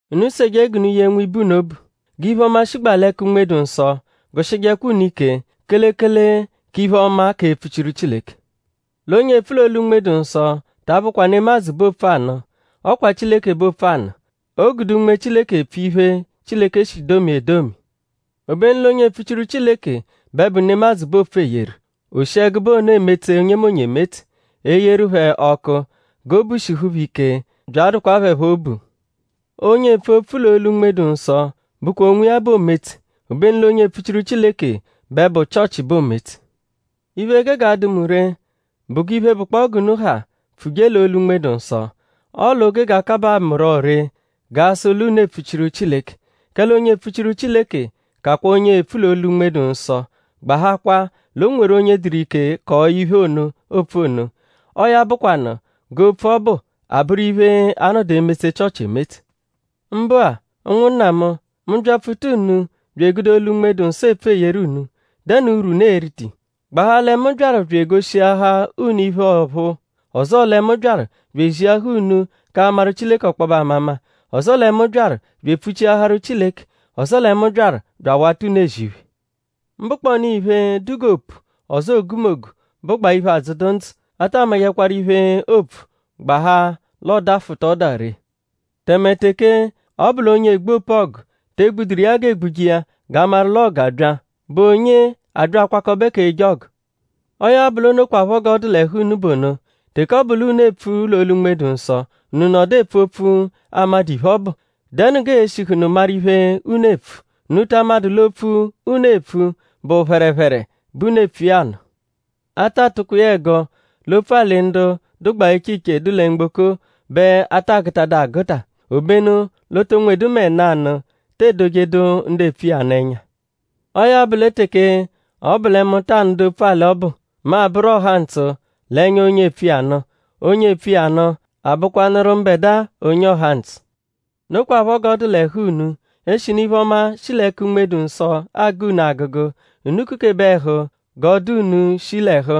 Unu seje g'unu yee nwibe unu obu. G'iphe-ọma, shigbaa l'ẹka Unme-dụ-Nsọ gụ-shijekwa unu ike; kelekele k'iphe-ọma k'epfuchiru Chileke. L'onye epfu l'olu Unme-dụ-Nsọ ta abụkwa nemadzụ bẹ oopfu anụ; ọ kwa Chileke bẹ oopfu anụ. O gude Unme Chileke epfu iphe, Chileke shi domia edomi. Obenu l'onye epfuchiru Chileke bẹ bụ nemadzụ bẹ oopfu eyeru. O shi ẹgube ono emetse onyemonye emetse; eyeru phẹ ọku g'obu shihu phẹ ike bya adụkwa phẹ phọ obu. Onye epfu opfu l'olu Unme-dụ-Nsọ bụkwa onwiya bẹ oometse; obenu l'onye epfuchiru Chileke bẹ bụ Chịochi bẹ oometse. Iphe, gege adụ mu ree bụ g'iphe, bụkpoo g'unu ha pfuje l'olu Unme-dụ-Nsọ; ọle o gege akabaa mu rọ ree g'a sụ l'unu epfuchiru Chileke. Kẹle onye epfuchiru Chileke kakwa onye epfu l'olu Unme-dụ-Nsọ; gbahakwaa l'o nweru onye dụru ike kọo iphe ono, oopfu ono. Ọo ya bụkwanu g'opfu ọbu a-bụru iphe, a-nọdu emetse Chịochi emetse. Mbụa; ụnwunna mu; mu -byapfuta unu bya egude olu Unme-dụ-Nsọ epfu eyeru unu;?dẹnu urwu, unu e-rita iya? Gbahaa lẹ mu byaru bya egoshiahaa unu iphe ọ̀phúú; ọzoo lẹ mu byaru bya eziahaa unu k'amaru Chileke ọkpobe amama; ọzoo lẹ mu byaru bya epfuchiaharu Chileke; ọzoo lẹ mu byaru bya awata unu ezi iphe. Mbụkpoonu iphe, dụ g'opu ọzoo ogumogu, bụgbaa iphe, adzụdu ndzụ; a ta amajẹkwaru iphe, oopfu gbahaa l'ọodafuta ọda ree. Tẹme teke ọ bụ l'onye egbu opu-ọgu te egbuduru iya g'eegbuje iya g'a maru l'ọgu abya;?bụ onye abya akwakọbe k'eje ọgu? Ọo ya bụ l'o nokwaphọ g'ọ dụ l'ẹhu unu bụ ono. Teke ọ bụ l'unu epfu l'olu Unme-dụ-Nsọ; unu nọdu epfu opfu, a madụ iphe, ọ bụ;?dẹnu g'ee-shihụnu maru iphe, unu eepfu? Unu ta amadụ l'opfu, unu epfu bụ phẹrephere bẹ unu epfu iya anụ. A ta atụkwa iya ẹgo l'opfu-alị ndu dụgbaa iche iche, dụ lẹ mgboko-a bẹ a ta agụtadu agụta; obenu l'o to nwedu mẹ nanụ te edojedu ndu epfu iya nụ ẹnya. Ọo ya bụ lẹ teke ọ bụ lẹ mu ta anụdu opfu-alị ọbu; mu abụru ọhantsu l'ẹnya onye epfu iya nụ; onye epfu iya nụ a bụkwanuru mbẹdua onye ọhantsu. Nokwaphọ g'ọ dụ l'ẹhu unu; eshinu iphe-ọma, shi l'ẹka Unme-dụ-Nsọ agụ unu agụgu; unu kukebe ẹhu g'ọ dụ unu shi l'ẹhu;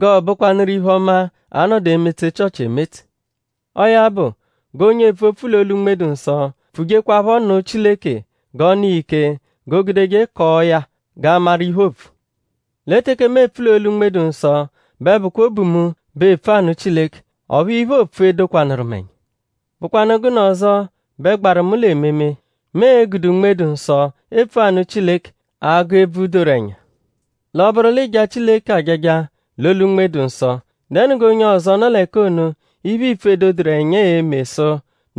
g'ọo-bụkwanuru iphe-ọma, a-nọdu emetse Chịochi emetse. Ọo ya bụ; g'onye epfu opfu l'olu Unme-dụ-Nsọ; pfujekwaphọ nụ Chileke g'ọ nụ iya ike g'o gudeje kọo ya g'a maru iphe, oopfu. Lẹ teke mu epfu l'olu Unme-dụ-Nsọ; bẹ bụkwa obu mu bẹ epfu anụ Chileke; ọphu iphe, oopfu edokwanụru mu ẹnya. ?Bụkwanu gụnu ọzo bẹ gbaru mu l'ememe? Mu e-gude Unme-dụ-nsọ epfu anụ Chileke; agụ ebvu, doru ẹnya. L'ọ -bụru l'ịija Chileke ajaja l'olu Unme-dụ-Nsọ;?dẹnu g'onye ọzo, nọ l'ẹka ono iphe, iipfu edoduru ẹnya e-me sụ: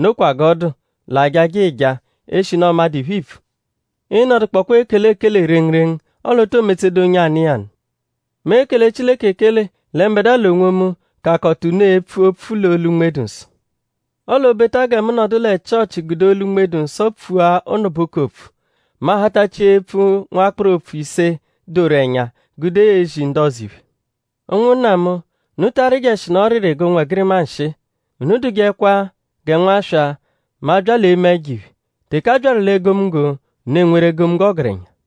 “Nokwa g'ọ dụ” l'ajaja ịija; eshinu ọ madụ iphe iipfu? Ịinodukpokwa ekele ekele rengurengu; ọle o too metsedu onye anụ iya nụ. Mu ekele Chileke ekele lẹ mbẹdua l'onwomu kakọta unu epfu opfu l'olu Unme-dụ-Nsọ. Ọle o -beta gẹ mu nọdu lẹ Chịochi gude olu Unme-dụ-Nsọ pfua ụnubuku opfu; mu ahatachia epfu nwakpụru opfu ise, doru ẹnya gude ezi ndu ọzo iphe. Ụnwunna mu; unu ta arịjeshinu ọriri g'ụnwegirima nshịi. Unu dụjekwa gẹ nwaswa mẹ a -bya l'eme ẹjo-iphe. Teke a byaru l'egomunggo; unu enweru egomunggo ọgerenya.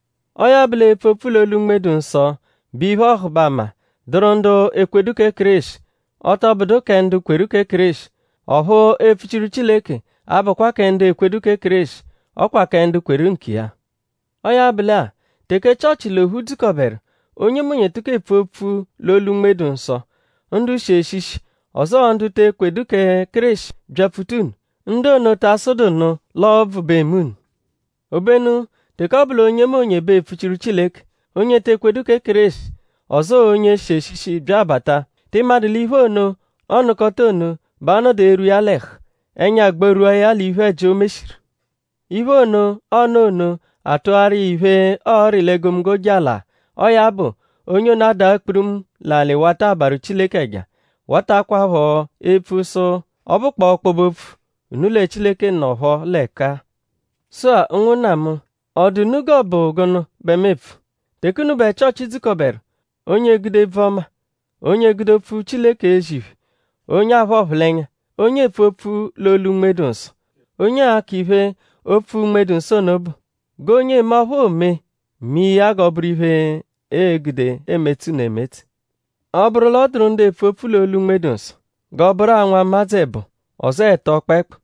Ọo ya bụ l'epfu opfu l'olu Unme-dụ-Nsọ bụ iphe-ọhubama, dụru ndu ekwedu kẹ Kéreshi; ọ tọ bụdu kẹ ndu kweru kẹ Kéreshi. Ọphu epfuchiru Chileke abụkwa kẹ ndu ekwedu kẹ Kéreshi; ọ kwa kẹ ndu kweru nkiya. Ọo ya bụ lẹ-a; teke Chịochi l'ophu dzukọberu; onyemonye tụko epfu opfu l'olu Unme-dụ-Nsọ; ndu shi eshishi; ọzoo ndu te ekwedu kẹ Kéreshi byapfuta unu;?ndu ono taa sụdunu l'ọo ọbvu bẹ eme unu? Obenu teke ọ bụ l'onyemonye bẹ epfuchiru Chileke; onye ete ekwedu kẹ Kéreshi; ọzoo onye shi eshishi bya abata;?tị madụ l'iphe ono, ọonukota ono bẹ a-nọdu erwu iya l'ẹhu; ẹnya agbarwua ya l'iphe-ẹji, o meshiru. Iphe ono, ọonu ono atụaru iya iphe, ọori l'egomunggo jala. Ọo ya bụ; onye ono adaa kpurumu l'alị wata abarụ Chileke ẹja; watakwaphọ epfu sụ: “Ọ bụkpoo ọkpobe-opfu; unu lẹ Chileke nọpho l'ẹka-a.” Sụ-a; ụnwunna mu;?ọ dụ unu g'ọ bụ gụnu bẹ mu epfu? Teke unubẹ Chịochi dzukọberu; onye egude ebvu-ọma; onye egude opfu Chileke ezi iphe; onye aphụ ọphulenya; onye epfu opfu l'olu Unme-dụ-Nsọ; onye akọ iphe, opfu Unme-dụ-Nsọ ono bụ. G'onye eme ọphu oome mee ya g'ọ bụru iphe, ee-gude emetse unu emetse. Ọ -bụru l'ọ dụru ndu epfu opfu l'olu Unme-dụ-Nsọ; g'ọ bụru-a nwụmadzu ẹbo; ọzoo ẹto kpẹekpu;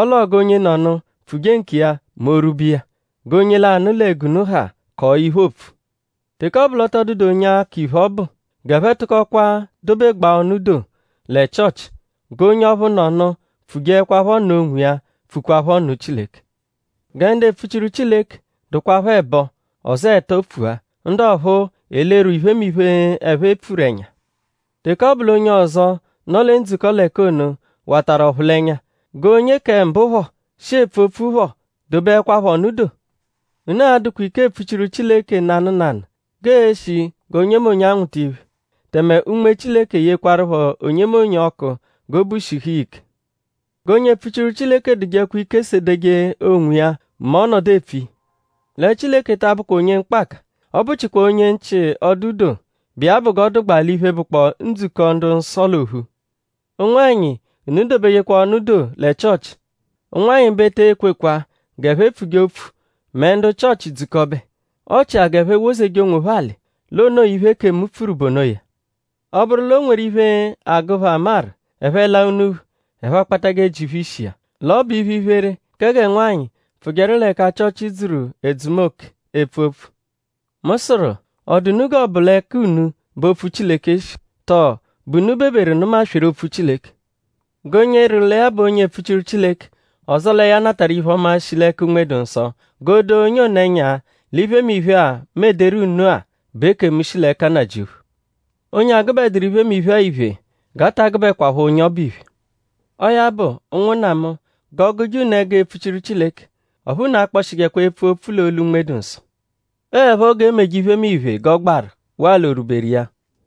ọ l'ọo g'onyenọnu pfuje nkiya mẹ o -rwube iya. G'onye lanụ lẹ g'unu ha kọo iphe, opfu. Teke ọ bụ l'ọ tọ dụdu onye akọ iphe, ọ bụ g'ẹphe tụkokwa dobegbaa ọnu doo lẹ Chịochi; g'onye ọphu nọnu pfujeẹkwapho nụ onwiya pfukwaphọ nụ Chileke. Gẹ ndu epfuchiru Chileke dụkwapho ẹbo; ọzoo ẹto pfua; ndu ọphuu elerwee iphemiphe, ẹphe pfuru ẹnya. Teke ọ bụ l'onye ọzo, nọ lẹ ndzukọ l'ẹka ono watarụ ọphulenya; g'onye kẹ mbụ phọ, shi epfu opfu phọ dobeẹkwapho ọnu doo. Unu a-dụkwa ike epfuchiru Chileke nanụ nanụ; g'e-shi g'onyemonye anwụta iphe; tẹme Unme Chileke eyekwarụpho onyemonye ọku g'obu shihu iya ike. G'onye epfuchiru Chileke dụjekwa ike sedeje onwiya mẹ ọ -nọdu epfu iya. Lẹ Chileke ta abụkwa onye mkpaka; ọ bụchikwaa onye nchị-ọdu-doo; bụ iya bụ g'ọ dụgbaa l'iphe, bụkpoo ndzukọ ndu-nsọ l'ophu. Ụnwanyi unu dobejekwa ọnu doo lẹ Chịochi. Ụnwanyi bẹ e te kwekwa g'ẹphe pfuje opfu mẹ ndu Chịochi dzukọbe. Ọ chia g'ẹphe wozeje onwophẹ alị; l'o noo iphe, ekemu pfuru bụ onoya. Ọ -bụru l'o nweru iphe, agụ phẹ amaru; ẹphe -laa unuphu; ẹphe akpatajẹ ji phẹ ishi iya. L'ọ bụ iphe-iphere kẹ gẹ nwanyị pfụjeru l'ẹka Chịochi dzuru edzumoke epfu opfu. Mu sụru;?ọ dụ unu g'ọ bụ l'ẹka unu bẹ opfu Chileke shi? Tọo?bụ unu beberu nụma-sweru opfu Chileke? G'onye rịru lẹ ya bụ onye epfuchiru Chileke; ọzoo lẹ ya natarụ iphe-ọma, shi l'ẹka Unme-dụ-Nsọ; g'o doo onye ono ẹnya l'iphemiphe-a, mu ederu unu-a bụ ekemu, shi l'ẹka Nnajịuphu. Onye agụbeduru iphemiphe-a iphe; g'a ta agụbekwapho onye ọbu iphe. Ọo ya bụ; ụnwunna mu; g'ọ gụje unu ẹgu epfuchiru Chileke. Ọphu unu akpọshijekwa epfu opfu l'olu Unme-dụ-Nsọ. Ọo 'ẹpho g'e meje iphemiphe g'ọ gbaru waa l'o rwuberu iya.